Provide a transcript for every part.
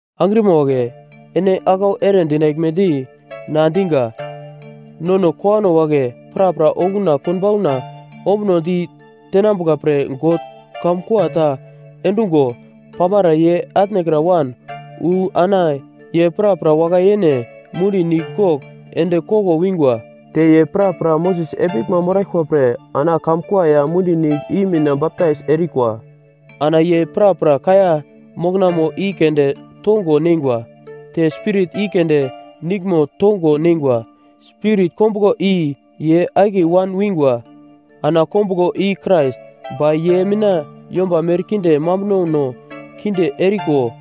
Angrima wagle, ene aglau ere dinaglmedi na diga: Nono kowano wagle prapra okuna konbauna ombunodi tenambuka pre God kamkua ta endungo pamara ye atnekra wan wu ana ye prapra wakai yene mundi nigl gogl ende koglo wingwa. Te ye prapra Moses epiglma moraglkwa pre ana kamkua ya mundi nigl i mina baptais erikwa. Ana ye prapra kaiya moknamo i keunde tongo neingwa, te spirit i keunde niglmo tongo neingwa, spirit kombuglo i ye akiye wan wingwa. Ana kombuglo i Krais. Ba ye mina yomba merkinde mambunono kinde eriko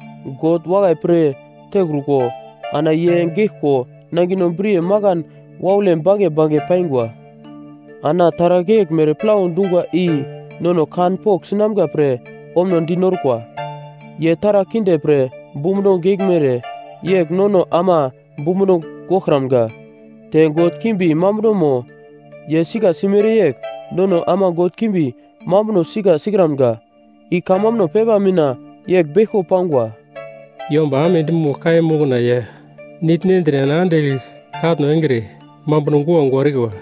God wakai pir tekruko ana ye geglko nangino briye makan waule bange bange paingwa. Ana taragl yeglmere plau dungwa i nono kanpogl sinamga pre ombunodi norkwa. Ye taragl kinde pre bumbuno geglmere yegl nono ama bumbuno goglkramga. Te god kimbi mambunomo ye sika simere yegl nono ama god kimbi mambuno sika sikramga. I kamambuno pepa mina yegl beglko pangwa: “Yomba amedi mogl kaiya mokna ya nigl nendre ana andigl katno engre mambuno guagua erikwa.”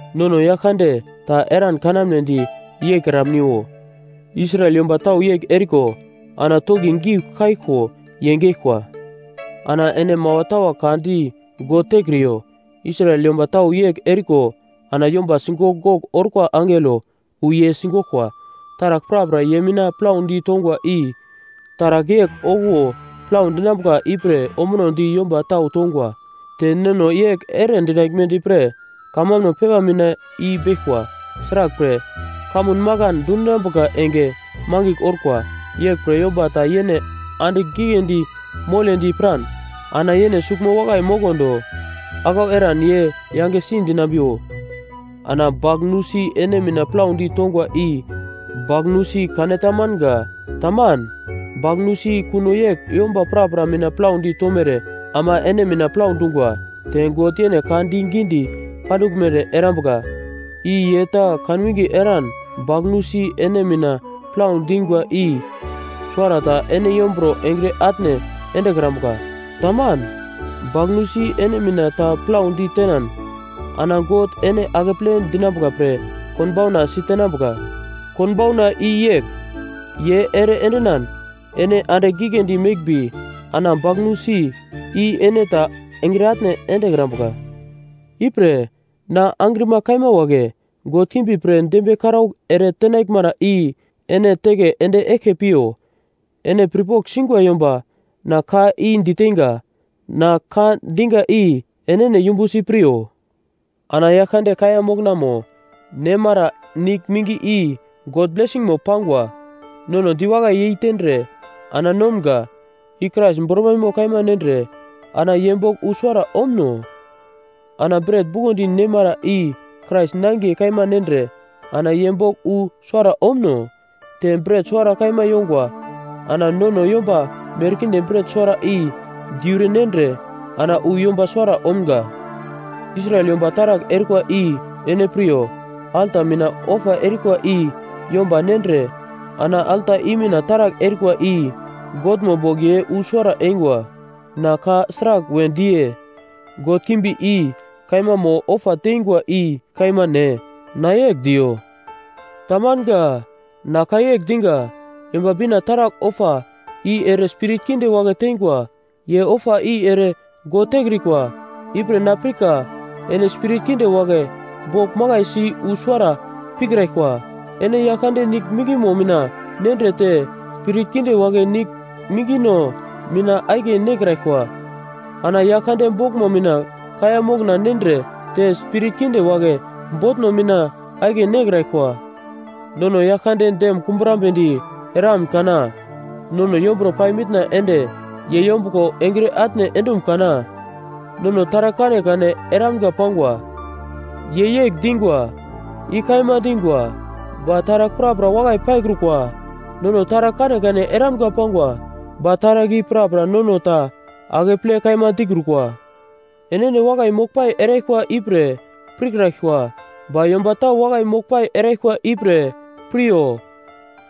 Nono Yaglkande, ta eran kanamnedi yeikramniwo, Israel yomba tau yegl eriko ana toki giugl kaiglko ye geglkwa. Ana ene mawa tawa ka di God tekriyo, Israel yomba tau yegl eriko ana yomba sigogl gogl orkwa angelo wu ye sigoglkwa. Taragl prapra ye mina plaudi tongwa i taragl yegl okuwo plau dinambuka ipre ombunodi yomba tau tongwa. Te nono yegl ere dinaglmedi pre kamambuno pepa mina i beglkwa. Sraglpre, kamun makan dundinambuka enge mangigl orkwa. Yeglpre yomba ta yene andigl giglendi moledi piran ana yene suglmo wakai moglo do, aglau eran ye yangesi dinambiwo. Ana bagl nusi ene mina plaudi tongwa i bagl nusi kane ta manga. Taman. Bagl nusi kuno yegl yomba prapra mina plaudi tomere ama ene mina plau dungwa. Te God yene ka digidi panduglmere erambuka, i ye ta kanwinge eran bagl nusi ene mina plau dingwa i suwarata ene yomburo engre atne endekrambuka. Taman. bagl nusi ene mina ta plaudi tenan ana God ene akeple dinambuka pre konbauna sitenambuka. Konbauna i yegl: Ye ere endinan ene andigl giglendi meglmbi ana bagl nusi i ene ta engre atne endekrambuka. Ipre na angrima kaima wagle, god kimbi pre dembiye karaugl ere tenaglmara i ene teke ende eglke piyo. Ene pirpogl singwa yomba na ka i diteinga. Na ka diga i enene yumbusi piryo. Ana Yaglkande kaiya moknamo nemara nigl mingi i God blesingmo pangwa; nono diwakai yeitendre ana nomga, i Krais bormaimo kaima nendre ana ye bogl wu suwara omuno? Ana bret bukondi nemara i Krais nangiye kaima nendre ana ye bogl wu suwara omuno? Te bret suwara kaima yongwa. Ana nono yomba merkinde bret suwara i diure nendre ana wu yomba suwara omga. Israel yomba taragl erikwa i ene piryo. Alta mina ofa erikwa i yomba nendre ana alta i mina taragl erikwa i Godmo bogl ye wu suwara eingwa. Na ka sragl we diye? “God kimbi i kaima mo ofa teingwa i kaima ne?” Na yegl diyo? Tamanga. Na ka yegl diga, “Yomba Bina taragl ofa, i ere spirit kinde wagle teingwa. Ye ofa i ere God tekrikwa.” Ipre na pirka ene spirit kinde wagle bogl makaisi wu suwara pikraglkwa. Ene Yaglkande nigl mingmo mina nendre te spirit kinde wagle nigl mingno mina akiye nekraglkwa. Ana Yaglkande boglmo mina kaiya mokna nendre te spirit kinde wagle botno mina akiye nekraglkwa. Nono Yaglkande dem kumbrambedi eramun kana? Nono yomburo pai mitna ende ye yombuglo engre atne endum kana? “Nono taragl kanekane eramga pangwa,” ye yegl dingwa. I kaima dingwa, ba taragl prapra wakai paikrukwa. “Nono taragl kanekane eramga pangwa,” ba taragl i prapra nono ta akeple kaima dikrukwa. Enene wakai moglpai eraglkwa ipre pirkraglkwa, ba yomba tau wakai moglpai eraglkwa ipre piryo.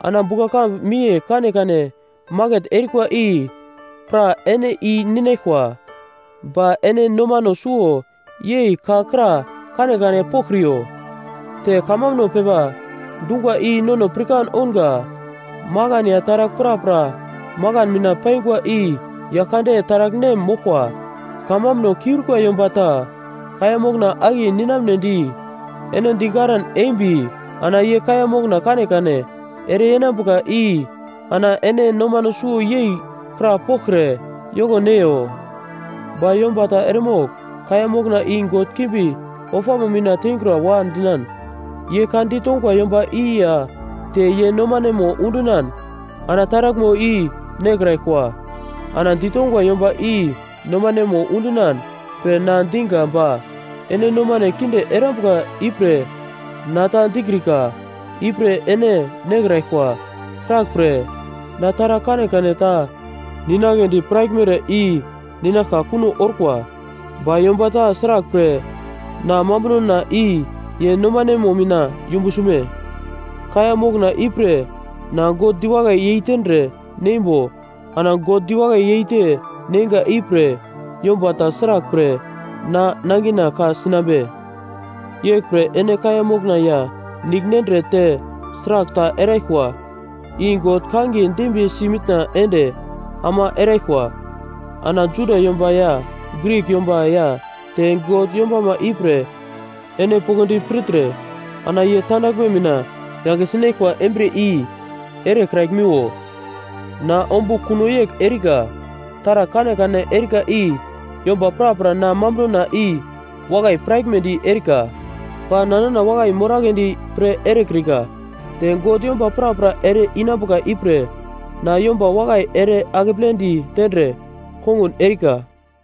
Ana bugla-kambu miye kanekane maket erikwa i pra ene i-ninaglkwa, ba ene nomano suwo yei ka kra kanekane poglkriyo. Te kamambuno pepa dungwa i nono pirkan ounga, “Makan ya taragl prapra makan mina paingwa i Yaglkande taragl-nem moglkwa.” Kamambuno kiurikwa yomba ta kaiya mokna akiye ninamnedi ene digaran embi ana ye kaiya mokna kanekane ereyenambuka i ana ene nomano suwo yei krapoglkre yoko neiyo. Ba yomba ta eremogl kaiya mokna i god kimbi ofamo mina tengura-wa dinan, ye ka ditongwa yomba i, ya te ye nomanemo undinan ana taraglmo i nekraglkwa, ana ditongwa yomba i nomanemo undinan pre na diga ba ene nomane kinde erambuka ipre na ta dikrika ipre ene nekraglkwa. Sraglpre, na taragl kanekane ta ninagledi piraglmere i ninaglka kuno orkwa. Ba yomba ta sraglpre na mambunona i ye nomanemo mina yumbu sume? Kaiya mokna ipre na God diwakai yeitendre neimbo, ana God diwakai yeite neinga ipre, yomba ta sraglpre na nangina ka-sinambe? Yeglpre ene kaiya mokna ya nigl nendre te sragl ta eraglkwa, i God kangiye dembiyesi mitna ende ama eraglkwa. Ana Juda yomba ya Grik yomba ya te God yombama ipre ene poglodi pirtre, ana ye tandaglme mina yange sinaglkwa embriye i erekraglmiwo. Na ombugl kuno yegl erika: Taragl kanekane erika i yomba prapra na mambunona i wakai piraglmedi erika, ba na nana wakai moragledi pre erekrika. Te God yomba prapra ere-inambuka ipre na yomba wakai ere akepledi tendre kongun erika.